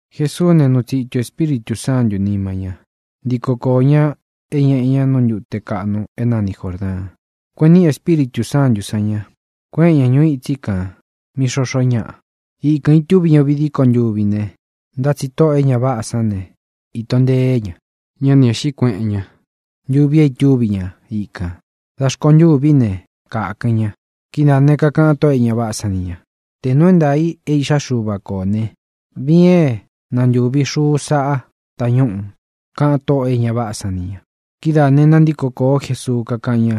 Jesuú ne, nuu tsitu Espíritū Sántū sán nima ñá, ntiko koō ña é ñeꞌē ña nú ntute kaꞌnu é nani Jōrdaan. Kueꞌen níꞌi Espíritū Sántū san ña, kuéꞌen ña ñūu îtsí kān mí xoxó ñaꞌa. Ikān itúvi ña uvi díko ntuvi ne, ntá tsi tóꞌō e ña váꞌā san ne, īto nteé ña. Ñá ni ēꞌxí kueꞌen ña ntuvi é itúvi ña ikān. Dā rkontûví ne, kākɨn ña. Kidáā né, kakaꞌan tóꞌō e ña váꞌā san ni ña: —Tē nuu é ntaā i é iꞌxá Xuva ko ō né, viin é nantūvi xuu sáꞌa tañúꞌū —kaꞌan tóꞌō e ña váꞌā san ni ña. Kidáā ne, nantíko kōó Jesuu, kakáꞌan ña: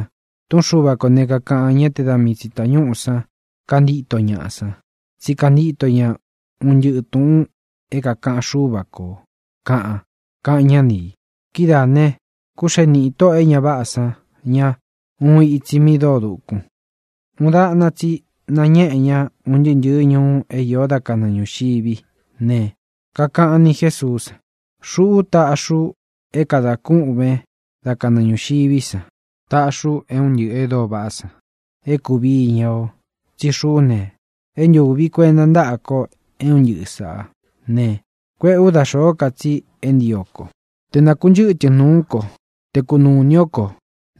—Tūꞌún Xuva kō ne, kakaꞌan: “Ñá te da mii tsi tāñúꞌū san kantío ñaꞌa san, tsí kantio ña un ntɨꞌɨ̄ túꞌūn é kākaꞌan Xúva kō”, kaꞌan —kaꞌan ñá ni ī. Kidáā ne, kúxee niꞌi tóꞌō e ña váꞌā san ña uun itsi mi dóo dūkun. Uun daꞌna tsi nañéꞌē ña un ntɨɨ́ ntɨ̄ɨ́ ñuu é īó da kanɨɨ ñūxiví ne, kakaꞌan ni Jésuú san: —Xuꞌú taꞌxi u é kadā kûꞌven dá kanɨɨ ñūxiví san. Taꞌxi u é un ntɨꞌɨ̄ e dóo vaꞌá san é kūví iña o. Tsí xuꞌú ne, é ntūvi kuenta ntáꞌa ko é un ntɨꞌɨ̄ sáꞌā ne, kuéꞌē ú da xōó ka tsi é ntio ko. Te nakūnchɨ́tɨn nūú ko ne, te kunūu ini ó ko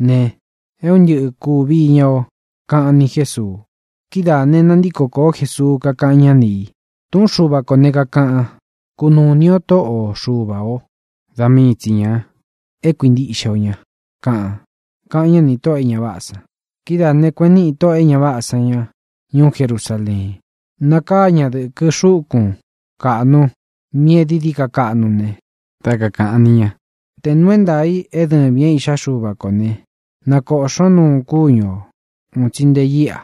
ne, é un ntɨꞌɨ kūvi iña o —kaꞌan ni Jésuu. Kidáā ne, nantíko kōó Jesuu, kakáꞌan ñá ni ī: —Tūꞌún Xuva ko ne, kākaꞌan: “Kunūu ini o Tóꞌo o Xuva ō. Da mii tsi ñā é kuīntiꞌxe o ña”, kaꞌan —kaꞌan ñá nī tóꞌō e ña váꞌā san. Kidáā ne, kueꞌen níꞌi tóꞌō e ña váꞌā san ña ñuú Jerusaleen. Nakáa ñā dɨkɨ xúkun kaꞌnu míꞌī e dií dií ka dukún ne, dá kakāꞌan ni ña: —Tē nuu é ntaā i é dɨvīn é Iꞌxá Xuva kō ne, nakōꞌxón nuun kúñu ō un tsi nte íꞌa.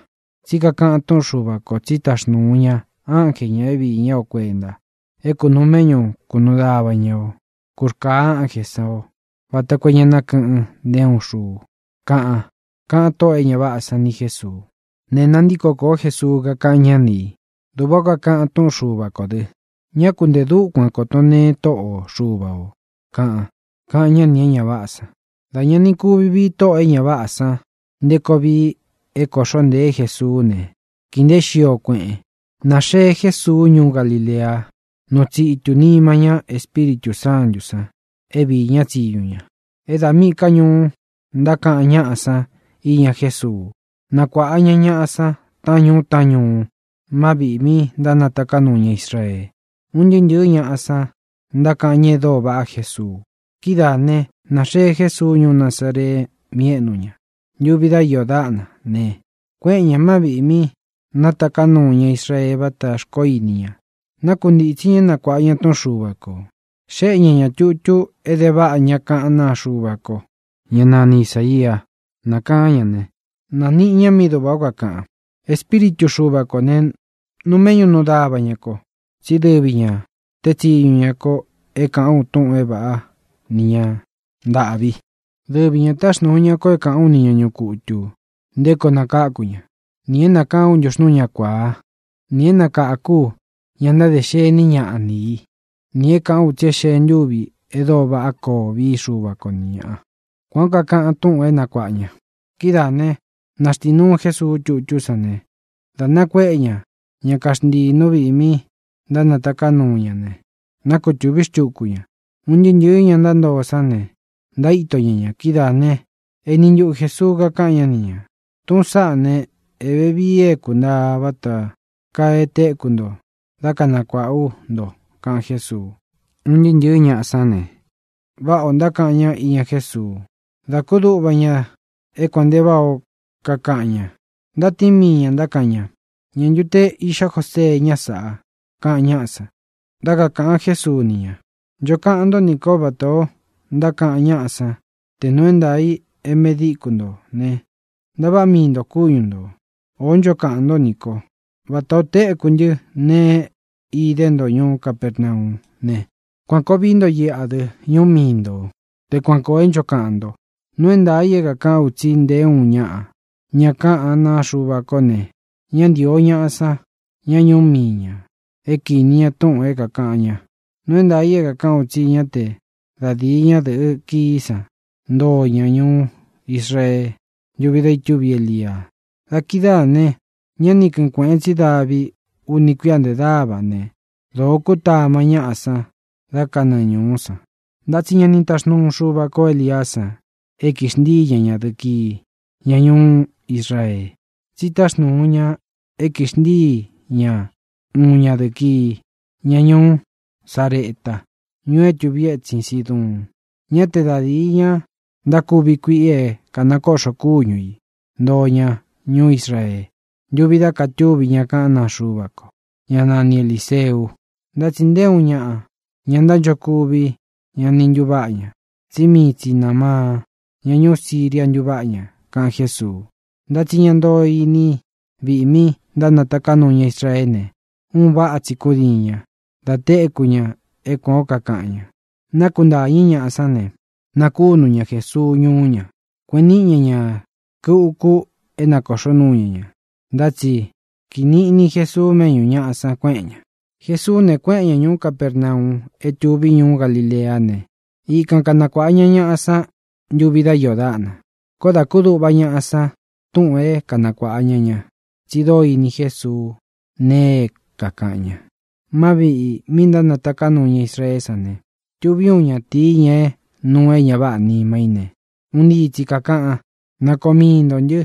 Tsí kakaꞌan túꞌun Xuva kō: Tsí taxnūu ña ánje ñā é viī ñá o kuenta, é kūnuu méꞌñu kūnuu dava ña o. Kūrkaa ánjē san o, vata koo é ña nákɨꞌɨn nté uun xuu, kaꞌan —kaꞌan tóꞌō e ña váꞌā san ni Jésuu. Ne, nántiko kōó Jesuu, kakáꞌan ñá ni ī: —Duꞌvā ó kakaꞌan túꞌun Xuva kō dɨ: “Ñá ku ntē dúkuan kōto nteen Tóꞌo o Xuva ō”, kaꞌan —kaꞌan ñá nī é ña váꞌā san. Dā ña ni kuvi vii tóꞌō e ña váꞌā san nté koo vii é kōꞌxó ntēé Jesuú ne, kīi nteé xio, kueꞌen. Nāxee Jésuu ñuú Galilea, nuu tsitu nima ñá Espíritū Sántū san é viī ñá tsiñu ña. É da míꞌī ká ñuú ntákaꞌan ñáꞌa san íña Jésuu. Nakuáꞌa ña ñāꞌa san taꞌán ñuu taꞌán ñuu má viꞌī mi ntánataká nuu ña Israee. Un ntɨɨ́ ntɨ̄ɨ́ ñaꞌa san ntákaꞌan ñá e dóo vaꞌá Jesuu. Kidáā né, nāxee Jésuu ñuú Nazaree, mí éꞌnu ña. Ntuvi dá iō dáꞌna ne, kuéꞌen ñā má viꞌī mí nataká nuu ña Israee váta xkoó ini ña. Nákuntītsí ña é nakuāꞌa ña túꞌun Xuva kō. Xéꞌe ña ña tūtu é de váꞌa ña kaꞌán naa Xuva ko, ñá nani Isāia. Nākaán ña ne, nāniꞌi ña mí duꞌvā ó kakaꞌan: Espíritu Xuva kō ne, nuu méꞌñu nuu dava ña ko, tsí dɨvi ñā teé tsiñu ña ko é kāꞌán u túꞌūn é vāꞌá ni ña ntāꞌvi. Dɨvi ñā táxnūu ña ko é kāꞌán u ni ña ñuꞌu kutū nté koo nakáku ña, nī é nākaán u ntuxnúu ña kuāa, nī é nakākú u ña ntáde xení ñaꞌa ni ī, nī é kāꞌán u tsi é xee ntúvi e dóo vaꞌá koo vií Xuva ko ni ñāꞌa. Kuān ó kakaꞌan túꞌūn é nakuāꞌa ña. Kidáā ne, naxtínuu Jesuu tútú san ne, dā nakuéꞌe ña ña kaxntiī nú viꞌī mi ntánataká nuu ña ne, nákutūví xtuku ña. Un ntɨɨ́ ntɨ̄ɨ́ ña ntoo sán ne, ntaíto ña ña. Kidáā ne, éni ntuꞌu Jēsuu kakáꞌan ñá ni ñā: —Tūꞌún saꞌá ne, é vevii é kākuntaa vata kaa e téku nto dá kanakuāꞌa ú nto —kaꞌan Jésuu. Un ntɨɨ́ ntɨ̄ɨ́ ñaꞌa sán ne, váꞌā ó ntákaꞌan ñá iña Jésuu. Da kúduꞌva ña é kuān nte váꞌā ó kakaꞌan ña. Ntatíin mii ñā, ntákaꞌan ña: —¿Ñā ntu te iꞌxá Josee ñá sāꞌa? —kaꞌan ñáꞌa san. Dá kakāꞌan Jésuu ni ña: —Ncho kaꞌan ntó nī kó vatā ó ntákaꞌan ñáꞌa san: “Tē nuu é ntaā i é medíku ntō ne, ntaváꞌa mii ntō kúñu ntō.” O ncho kaꞌan ntó nī ko: “Vatā o téku ntɨ́ nēe é idé nto ñuú Capernaú ne, kuān koo vií nto iꞌa dɨ, ñuú mii ntō”, te kuan kōo é ncho kaꞌan nto. ʼNuu é ntaā i é kākaꞌán u tsi nté uun ñaꞌa ña kaꞌán naa Xuva ko ne, ñá ntīo ñaꞌa san, ña ñuú mii ñā, é kīni ña túꞌūn é kākaꞌan ña. Nuu é ntaā i é kākaꞌán u tsi ñá te da dīi ñadɨꞌɨ́ kií san ntoo ña ñuú Israee ntuvi da itúvi Elia. Dā kidáā ne, ña ni kɨ́ɨn kuēꞌen tsi davi uni kuia nte dáva ne, dōo kútama ñaꞌa san da kanɨɨ ñūú san. Ntá tsi ña ni taxnúu Xuva kō Eliá san e kixntíi ña ñadɨ̄ꞌɨ kii, ña ñuú Israee, tsi táxnūu ña ña é kixntíi ña uun ñadɨ̄ꞌɨ kii, ña ñuú Sareta, ñuu é tuvi étsin Siduun. Ñá te da dīi ña ntákuvi kuiꞌi é kānakoꞌxo kúñu ī ntóo ña ñuú Israee ntuvi da katúvi ña kaꞌán naa Xuva ko, ñá nani Elīseu, ntá tsi nté uun ñaꞌa, ña ntánchokuvi, ña ni ntuváꞌa ña. Tsí mii tsi Nāmaan, ña ñuú Siria, ntuváꞌa ña —kaꞌan Jésuu. Ntá tsi ña ntoo iní viꞌi mí nataká nuu ña Israeé ne, un váꞌa tsi kúdiin ña dā téku ña é kuān ó kakaꞌan ña. Nákuntāñɨ́ ñaꞌa sán ne, nakunu ña Jesuu ñuú ña. Kueꞌen níꞌi ña ñā rkɨ uku é nakōꞌxó nuu ñá ña. Ntá tsi kíi niꞌni Jēsuu méꞌñū ñaꞌa san, kuéꞌen ñā. Jesuú ne, kuéꞌen ña ñūú Capernau é tuví ñuú Galileá ne, ikan kanakuāꞌa ña ñáꞌa san ntúvi dá iō dáꞌna. Koó dā kúduꞌva ñaꞌa san túꞌūn é kanakuāꞌa ña ña, tsi dóo ini Jesuu nee é kākaꞌan ña. Má viꞌī mí nataká nuu ña Israeé san ne, tuví uun ñatīi, ña é nuu é ña váꞌā nima í ne, un ntii tsi kākaꞌan: —¡Na koo mii ntō ntɨ!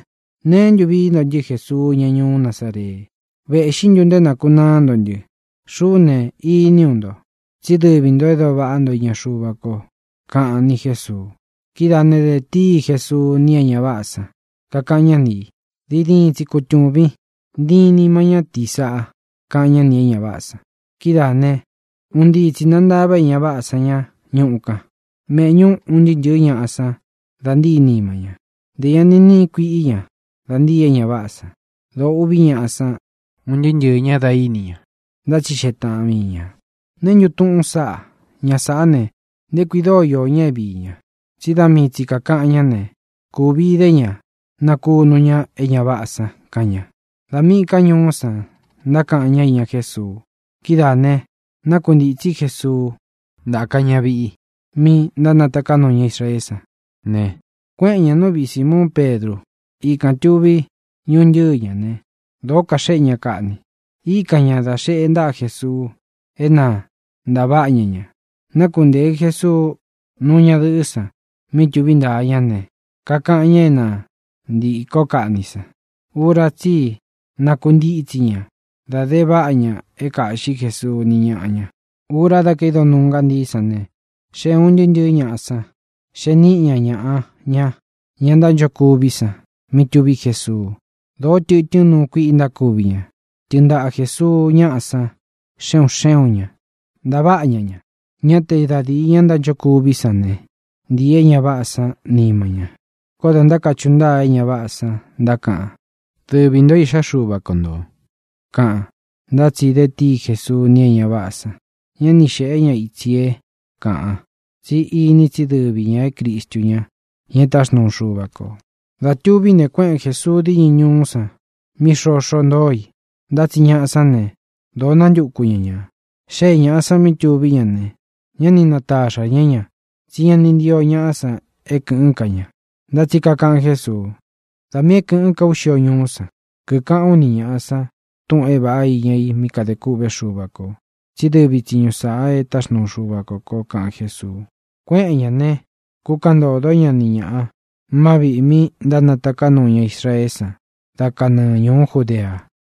¿Neé ntu viī ntó nī ntɨ́, Jesuu, ña ñuú Nazaree? ¿Vēꞌxí ntu nto é nākunaá nto ntɨ? Xuꞌú ne, iní u nto, tsí dɨvi ntō e dóo vaꞌá nto iña Xuva ko —kaꞌan ni Jésuu. Kidáā ne, de tíi Jesuu ni é ña váꞌā san, kakaꞌan ñá ni ī: —¡Diin tsi kutūvin! ¡Ntiin nima ñátīí sāꞌa! —kaꞌan ñá nī e ña váꞌā san. Kidáā né, un ntii tsi nāntava é ña váꞌā san ña ñuꞌu kan, méꞌñū un ntɨɨ́ ntɨ̄ɨ́ ñaꞌa san da ntíi nima ña. Ntē ña ni níꞌi kuiꞌí ña da ntii é ña váꞌā san. Dōo uꞌví ñaꞌa san un ntɨɨ́ ntɨɨ̄ ñá da íni ña. Ntátsixeꞌe taꞌan mii ñā: —¿Neē ntú tuꞌun sáꞌā? Ña sāꞌá ne, ¿nté kui dóo iō ña é viī ña? Tsi dá mii tsi kākaꞌan ñá ne, kūvi idé ña nakúnu ña é ña váꞌā san —kaꞌan ña. Da míꞌī ká ñuú san ntákaꞌan ñá iña Jésuu. Kidáā ne, nákuntītsí Jesuu, ntáka ña viꞌi mi ntánataká nuu ña Israeé san ne, kuéꞌen ñā nú viꞌi Sīmuun Pedru. Ikān tuví ñuntɨ́ɨ ña ne, dōo kaxéꞌe ña kaꞌni. Íkan ña dā xeꞌe ntáꞌa Jesuu é na ntāváꞌa ña ña. Nákuntēɨ Jesuu nuu ñadɨꞌɨ́ san mí tuví ntaa ña ne, kakaꞌan ña é na ntīkó kaꞌni san. Ura tsí i nakuntítsi ña, da de váꞌa ña é kāꞌxí Jesuu ni ñáꞌa ña. Ura da kaído nuu ngántií san ne, xée ūn ntɨɨ́ ntɨ̄ɨ́ ñaꞌa san, xee níꞌi ña ñaꞌa ña, ña ntánchokuví san, mí tuví Jesuu. Dōó tɨtɨ́n nuu kuíꞌi ntákuvi ña. Tɨɨn ntaꞌa Jēsuu ñáꞌa san xe un xé un ñā, ntaváꞌa ña ña. Ñá te da dīi ña ntánchokuví san ne, ntīi é ña váꞌā sán nima ña. Koó dā ntákachuꞌu ntáa é ña váꞌā san, ntákaꞌan: —¡Dɨvi ntō é Iꞌxá Xuva ko ntō! —kaꞌan. Ntá tsi de tíi Jesuu ni é ña váꞌā san. Ñá ni xēꞌé ña itsi é kāꞌan, tsí ini tsí dɨvi ñā é Cristu ña, ña e táxnuu Xuva kō. Dā tuví ne, kuéꞌen Jēsuu díñɨ ñūú san mí xoxo ntóo i. Ntá tsi ñaꞌa sán ne, dōo nántuku ña ñā. Xée ñāꞌa san mí tuví ña ne, ñá ni nataxā ñá ña, tsí ña ni ntío ñaꞌá san é kɨ̄ꞌɨ́n ka ña. Ntá tsi kakaꞌan Jésuu: —Da miī é kɨ̄ꞌɨ́n ka ú xio ñuú san, kikaꞌán u ni ñāꞌa san túꞌūn é vāꞌa iña i mí kadē kûꞌvé Xuva kō, tsí dɨvi tsiñu sāꞌa e táxnuu Xuva kō ko —kaꞌan Jésuu. Kuéꞌen ñā ne, kukaꞌan ntódo ña ni ñāꞌa má viꞌī mi ntánataká nuu ña Israeé san dá kanɨɨ ñūú Judea.